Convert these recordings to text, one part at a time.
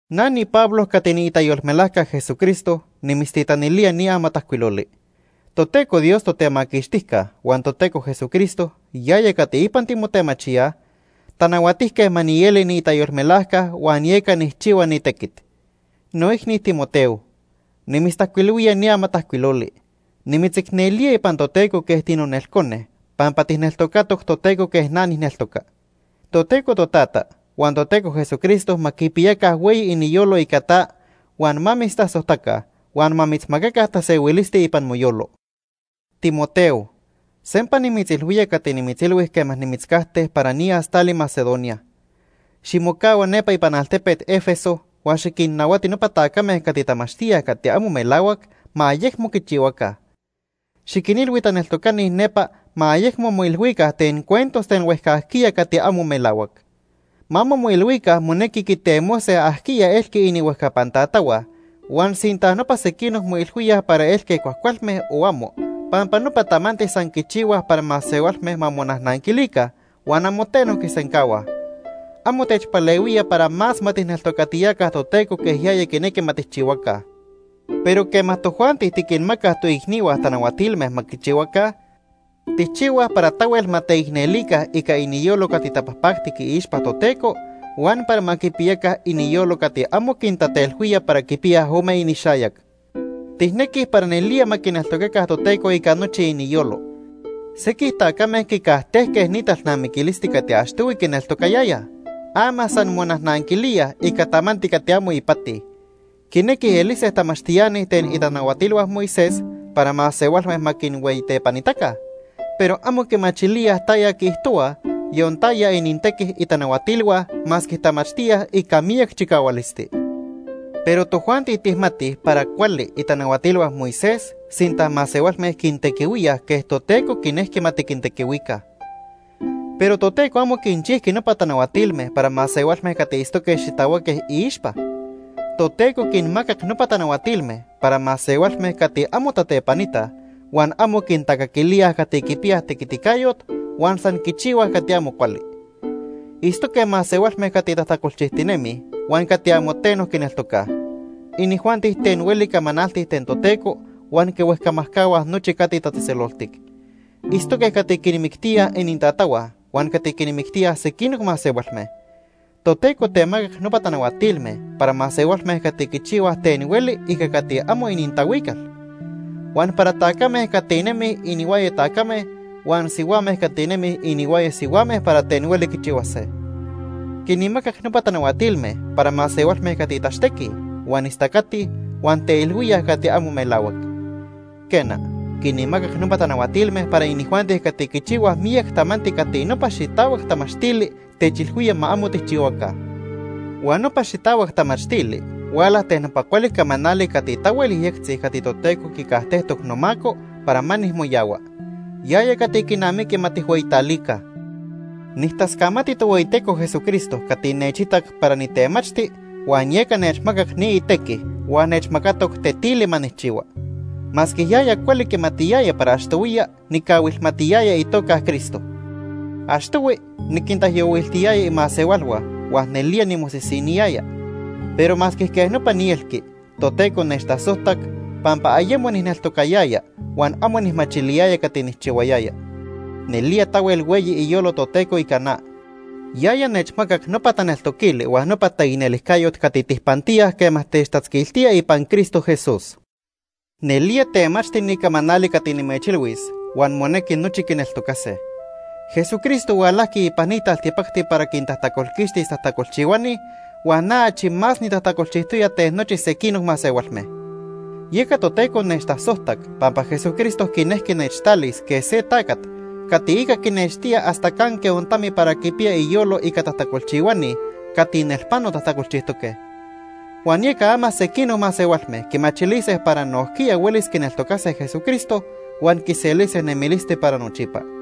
Na niPablo cati niitayolmelajca Jesucristo nimitztitanilía ni amatajcuiloli. Toteco Dios Totemaquixtijca huan Toteco Jesucristo yaya cati ipan timotemachíaj tanahuatijque ma nieli niitayolmelajca huan yeca nijchihua ni tequit. Noicni Timoteo, nimitztajcuilhuía ni amatajcuiloli. Nimitzicnelía ipan Toteco quej tinonelcone, pampa tijneltocatoc Toteco quej na nijneltoca. Toteco Totata huan Toteco Jesucristo ma quipiyaca hueyi iniyolo ica ta, huan ma mitztasojtaca huan ma mitzmacaca tasehuilisti ipan moyolo. Timoteo, sempa nimitzilhuía cati nimitzilhui quema nimitzcajte para niyas tali Macedonia. Ximocahua nepa ipan altepet Éfeso huan xiquinnahuati nopa tacame cati tamachtíaj cati amo melahuac ma ayecmo quichihuaca. Xiquinilhui taneltocani nepa ma ayecmo moilhuica ten cuentos ten huejcajquiya cati amo melahuac. Ma amo moilhuica monequi quitemose ajquiya elqui inihuejcapan tatahua huan sinta nopa sequinoc moilhuíaj para elque cuajcualme o amo, pampa nopa tamanti san quichihuaj para masehualme ma monajnanquilica huan amo teno quisencahuaj. Amo techpalehuía para más ma tijneltocatiyaca Toteco quej yaya quinequi ma tijchihuaca. Pero quema tojuanti tiquinmacaj toicnihua tanahuatilme ma quichihuaca, tijchihuaj para tahuel ma teicnelica ica iniyolo cati tapajpactic iixpa Toteco huan para ma quipiyaca iniyolo cati amo quintatelhuía para quipiyaj ome inixayac. Tijnequij para nelía ma quineltocaca Toteco ica nochi iniyolo. Sequij tacame quicajtejque ni talnamiquilisti cati achtohui quineltocayayaj. Ama san monajnanquilíaj ica tamanti cati amo ipati. Quinequij elise tamachtiani ten itanahuatilhua Moisés para masehualme ma quinhueyitepanitaca, pero amo quimachilíaj taya quiijtohuaj, yon taya inintequi itanahuatilhua masque tamachtíaj ica miyac chicahualisti. Pero tojuanti tijmatij para cuali itanahuatilhua Moisés sinta masehualme quintequihuíaj quej Toteco quinejqui ma tiquintequihuica. Pero Toteco amo quinchijqui nopa tanahuatilme para masehualme cati itztoque xitahuaque iixpa. Toteco quinmacac nopa tanahuatilme para masehualme cati amo tatepanitaj, huan amo quintacaquilíaj cati quipiyaj tequiticayot, huan san quichihuaj cati amo cuali. Itztoque masehualme cati tajtacolchijtinemij huan cati amo teno quineltocaj. Inijuanti ten hueli camanaltij ten Toteco huan quihuejcamajcahuaj nochi cati tatzejtzeloltic. Itztoque cati quinmictíaj inintatahua huan cati quinmictíaj sequinoc masehualme. Toteco temacac nopa tanahuatilme para masehualme cati quichihuaj ten hueli ica cati amo inintahuical, huan para tacame cati nemij inihuaya tacame, huan sihuame cati nemij inihuaya sihuame para ten hueli quichihuase. Quinmacac nopa tanahuatilme para masehualme cati tachtequij, huan istacatij, huan teilhuíaj cati amo melahuac. Quena, quinmacac nopa tanahuatilme para inijuanti cati quichihuaj miyac tamanti cati nopa xitahuac tamachtili techilhuía ma amo tijchihuaca. Huan nopa xitahuac tamachtili huala ten nopa cuali camanali cati tahuel yejyectzi cati Toteco quicajtejtoc nomaco para ma nijmoyahua. Yaya cati quinamiqui ma tijhueyitalica. Nijtascamati Tohueyiteco Jesucristo cati nechitac para nitemachti huan yeca nechmacac ni itequi huan nechmacatoc tetili ma nijchihua. Masque yaya cuali quimatiyaya para achtohuiya nicahuilmatiyaya itoca Cristo. Achtohui niquintaijyohuiltiyaya imasehualhua huan nelía nimosisiniyaya. Pero masque quej nopa nielqui, Toteco nechtasojtac pampa ayemo nijneltocayaya huan amo nijmachiliyaya cati nijchihuayaya. Nelía tahuel hueyi iyolo Toteco ica na. Yaya nechmacac nopa taneltoquili huan nopa taicnelijcayot cati tijpantíaj quema techtatzquiltía ipan Cristo Jesús. Nelía temachti ni camanali cati nimechilhuis huan monequi nochi quineltocase: Jesucristo hualajqui ipan ni taltipacti para quintajtacolquixtis tajtacolchihuani huan na achi más nitajtacolchijtoya ten nochi sequinoc masehualme. Yeca Toteco nechtasojtac pampa Jesucristo quinejqui nechtalis quej se tacat cati ica quinextía hasta canque ontami para quipiya iyolo ica tajtacolchihuani cati nelpano tajtacolchijtoque. Huan yeca ama sequinoc masehualme quimachilise para nojquiya huelis quineltocase Jesucristo huan quiselise nemilisti para nochipa.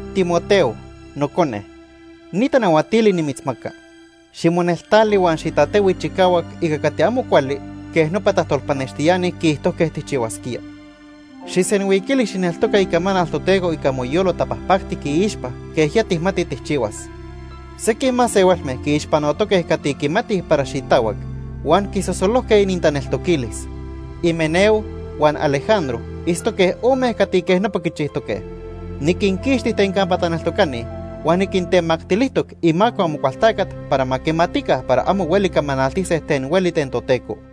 Timoteo, nocone, ni tanahuatili nimitzmaca. Ximoneltali huan xitatehui chicahuac ica cati amo cuali quej nopa tajtolpanextiani quiijtojque tijchihuasquía. Xijsenhuiquili xijneltoca icamanal Toteco ica moyolo tapajpactic iixpa quej ya tijmati tijchihuas. Sequij masehualme quiixpanotoque cati quimatij para xitahuac huan quisosolojque inintaneltoquilis. Himeneo huan Alejandro itztoque ome cati quej nopa quichijtoque. Niquinquixti ten campa taneltocani huan niquintemactilijtoc imaco Amocualtacat para ma quimatica para amo hueli camanaltise ten hueli ten Toteco.